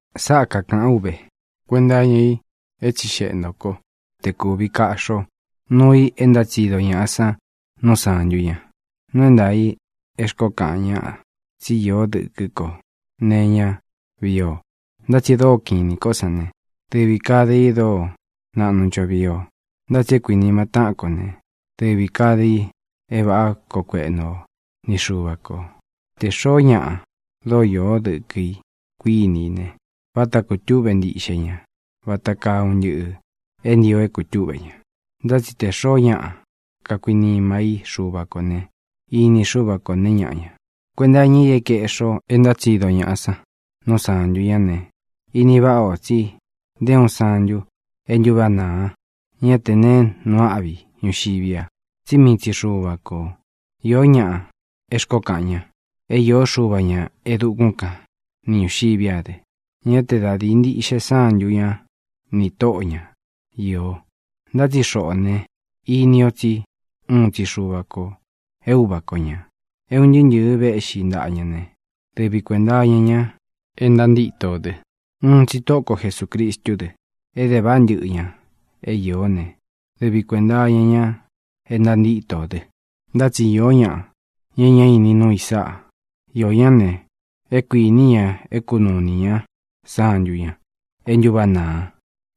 Sáꞌā kakaꞌán u ve kuenta iña i é tsíxeꞌe ntō kó te kūvi kaꞌxi ó nuu i é ntátsido ñaꞌa san nú sāntu ña. Nuu é ntaā i é xkoó kaꞌan ñáꞌa tsí īó dɨkɨ kó nee iñá vii o. Ntá tsi e dóo kiꞌin inī kó san ne, dɨvī kade i e dóo naꞌnu ncho vii o. Ntá tsi é kuinima táꞌan kō né, dɨvī kade i é vāꞌá koo kueꞌnu o ni Xuva kō. Tē xoó ñaꞌa dóo iō dɨ́kɨ ī, kuíni i ne, váta kūtúꞌve ntiꞌxe ña vata kaa un ntɨꞌɨ̄ é ntio é kūtúꞌve ña. Ntá tsi te xōo ñáꞌa kakuinimá i Xuva kō ne, ini Xúva ko nēe ñáꞌa ña. Kuenta iña i é kaeꞌxi o é ntátsido ñaꞌa san nú sāntu ñá ne, ini váꞌa ō tsi nté uun santu e ntúváꞌa nāa ña te neé nuu áꞌvi i ñuxiví a, tsí mii tsi Xuva kō. Īó ñaꞌa é xkoó kaꞌan ña é īó xuva ña e dukún kan ni ñūxiví a dɨ. Ñá te da dīi ntiꞌxe sántu ña nī tóꞌo ña iō. Ntá tsi xoꞌō ne, ini o tsi úun tsi Xuva kō é Uva ko ñā. É un ntɨɨ́ ntɨ̄ɨ véꞌxi ntaꞌa ña ne, dɨvi kuēnta iña ña é ntantíto ō dɨ. Uun tsi Tóꞌo ko Jesūcristú dɨ. Ede váꞌa ntɨꞌɨ ña é iō né, dɨvi kuēnta iña ña é ntantíto ō dɨ. Ntá tsi īó ñaꞌa, ña e ñá ini nuu i sáꞌa. Iō ñá ne, é kuīní ña é kunuu inī ñá santu ña e ntúváꞌa nāa.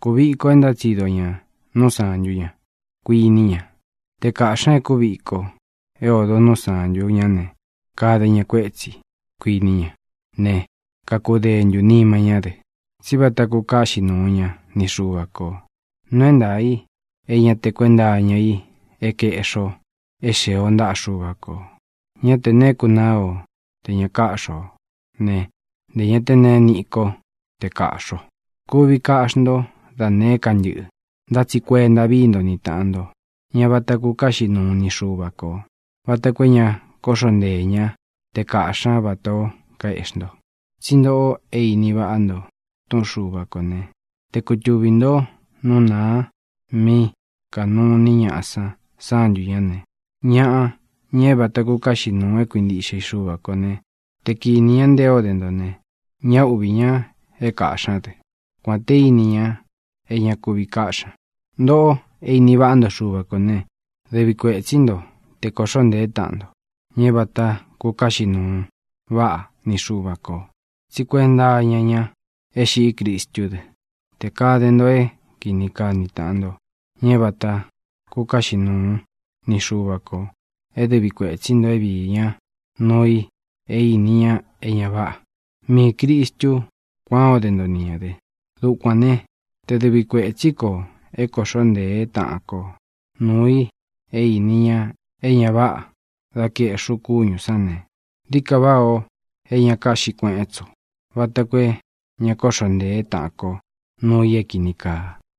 Kūviko e ntátsido ña nú sāntu ña, kuiní ña. Te kāꞌxi ña e kuvíko é odo nú sāntu ñá ne, kade ña kuétsi, kuiní ña ne, kakudentu nima ñá dɨ, tsí vata kukaꞌxí nuu ña ni Xuva kō. Nuu é ntaā i é ña te kuenta iña i é kaeꞌxi o é xee o ntaꞌa Xuva kō. Ñá te neé kunaa o te ña káꞌxi o ne, ntē ña té neé niꞌi ko té kāꞌxi o. Kuvi kaꞌxi ntó da nēé ka ntɨꞌɨ, ntá tsi kuenta vií nto ni tāꞌan nto, ña vata kukáꞌxi nuu ni Xuva kō, vata koo é ña kóꞌxo nteē ñá te kāꞌxi ñá vatā ó kaeꞌxi nto. Tsí ntoꞌo é ini váꞌa nto túꞌun Xuva kō né, te kutuvī ntó nú nāa mí kanuu iní ñaꞌa san sántu ñā ne, ñaꞌa, ña é vata kukáꞌxi nūu é kuintiꞌxe i Xuva kō ne, te kinī ñá nté o de nto ne, ñá uꞌvī ña é kāꞌxi ñá dɨ, kuān té ini ña é ña kúvi káꞌxi ña. Ntoꞌó é ini váꞌa nto Xuva kō ne, dɨvi kuētsí nto te kōꞌxó ntēé taꞌan nto, ña é vata kukáꞌxi nūu váꞌa ni Xuva kō. Tsí kuenta iña ña é xiꞌí Cristú dɨ. Tē kade nto é kīni kaá ni tāꞌan nto, ña é vāta kukáꞌxi nuu ni Xuva kō é dɨvi kuētsí nto é viī ñá nuu i é ini ña é ña váꞌā. Miī Cristú kuān ó de nto ni ñā dɨ. Dukuān né, te dɨvi kuētsí ko é kōꞌxó nteé taꞌan ko nuu i é īni ña é ña váꞌā dá kaeꞌxi ú kúñū sán ne, dií ka váꞌā o é ña kaꞌxí kueꞌen tsi ú, vata koo é ña kóꞌxo ntēé taꞌan ko nuu i é kīni kaa.